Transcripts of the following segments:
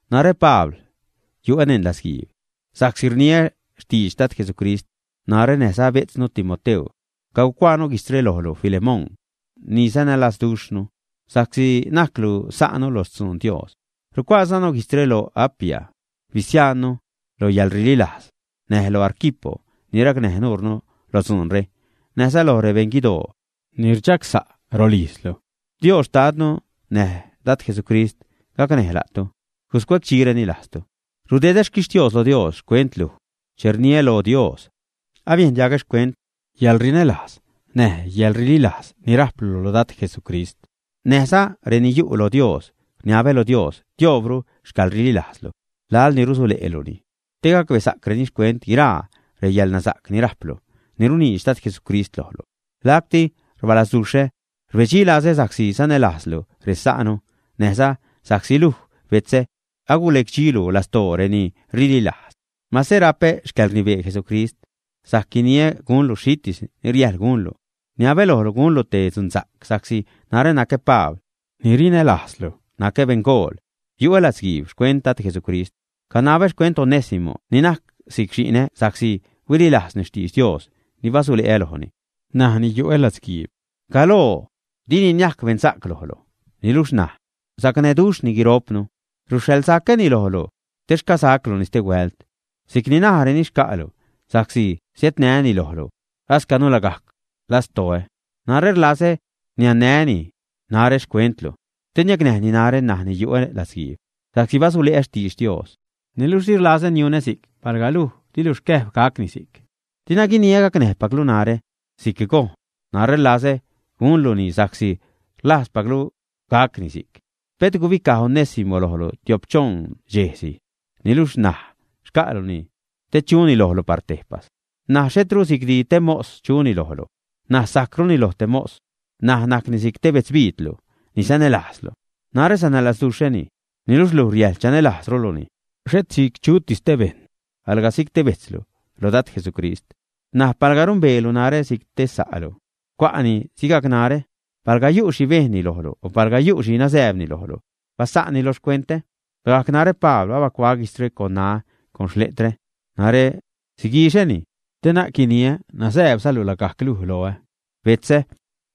Narä, Pabl, yu'ä neṉ latzguiib sa'csi rniä xtidx Dad Jesucrist. Narä näjza bejtznu Timoteu cagucuaanu guijtzre lojlu, Filemón, ni sanälazduxhnu sa'csi najclu sa'nu lo xtzun Dios. Rucuaazanu guijtzre lo Apia, bisiajnnu lo yäḻrililajz, näj lo Arquipo ni racnäj nuurnu lo dzuunre, näjza loj rebeṉguidoo ni rchagsa' rolijzlu. Dios Xtadnu näj Dad Jesucrist gacnäj la'tu, guscuedxireni lajztu. Rudedä xquixtios lo Dios xcuent luj che rniä lo Dios. Abiejn diagä xcuent yäḻrinälajz näj yäḻrililajz ni rajplu lo Dad Jesucrist, näjza reni yu' lo Dios. Rniabä lo Dios tioobru xcäḻrililajzlu laḻ ni rusule'luni, te gacbesa'creni xcuent guiraa reyäḻnasa'c ni rajplu, ni runiidx Dad Jesucrist lojlu. Lacti rbalazduxhä, rbedxi lazä sa'csi sanälajzlu resa'nu näjza sa'csi luj, betzä, agulecdxilu lastoo reni rililajz. Mase rapä xcäḻrnibee Jesucrist sajc guiniä gunlu xhitis ni riäjḻ gunlu, rniabä lojlu gunlu te dzunsa'c sa'csi narä nacä Pabl ni rinälajzlu, nacä beṉgool, yu'ä latzguiib xcuent Dad Jesucrist. Canabä xcuent Onésimo ni najc si'c xi'nä, sa'csi huililajzni xtidx Dios ni basule'ä lojni ṉaj ni yu'ä latzguiib. Galoo, dini niajc beṉsa'c lojlu, niluxh ṉaj sacnäduxhni guiro'pnu. Ruxhaḻsacäni lojlu, te xcasacluni stehuält si'c ni najräni xca'lu, sa'csi siädnäni lojlu ascanu lagajc lastoä. Narä rlazä niannäjni narä xcuentlu, te niacnäjni narä ṉaj ni yu'ä latzguiib sa'csi basule'ä xtidx Dios. Niluxh di rlazä niunä si'c palga luj dilu xcäjb gacni si'c. Dina guinia gacnäjpaclu narä si'c gojn. Narä rlazä gunluni sa'csi rlajzpaclu gacni si'c. Pet gubicaj Onésimo lojlu tio'p-choṉ dxejsi. Niluxh ṉaj xca'luni te chuni lojlu par tejpas. N̲aj xhetru si'cdi te mos chuni lojlu. N̲aj sajcruni loj te mos. N̲aj najcni si'c te betzbiidlu ni sanälajzlu. Narä sanälazduxhäni, niluxh luj riäjḻ chanälajzruluni, xhet si'c chutis te bejṉ, alga si'c te bejtzlu lo Dad Jesucrist. Näj palga rumbeelu narä si'c te sa'lu, cua'ni sigajc narä. Palga yu' xhi bejnni lojlu o palga yu' xhi nazääbni lojlu, basa'nni lo xcuentä. Lagajc narä, Pabl abacuaä guijtzre con ṉaä con xleträ, narä siguixäni. (Te na'c guiniä nazääbzalu lagajc luj loä.) Betzä,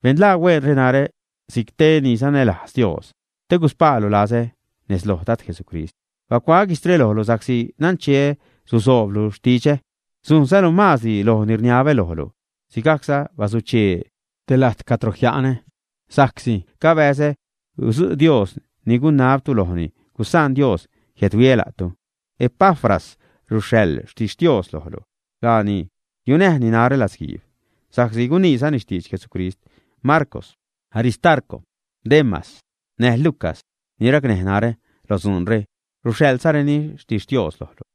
benḻaa hueenre narä si'c te ni sanälajz Dios te guspaalu lazä nez loj Dad Jesucrist. Bacuaä guijtzre lojlu sa'csi nancheä susooblu xtidxä, sujnzalu maazdi loj ni rniabä lojlu. Sigajcza basuchee te lajt cadro jia'nä, sa'csi cabäzä gudzu' Dios ni gunabtu lojni, gusaan Dios jiädhuiä la'tu. Epafras ruxhaḻ xtixtios lojlu. Laani yunäjni narä latzguiib, sa'csi guniizani xtidx Jesucrist. Marcw, Aristarco, Demas, näj Lucas, ni racnäj narä lo dzuunre, ruxhaḻzareni xtixtios lojlu.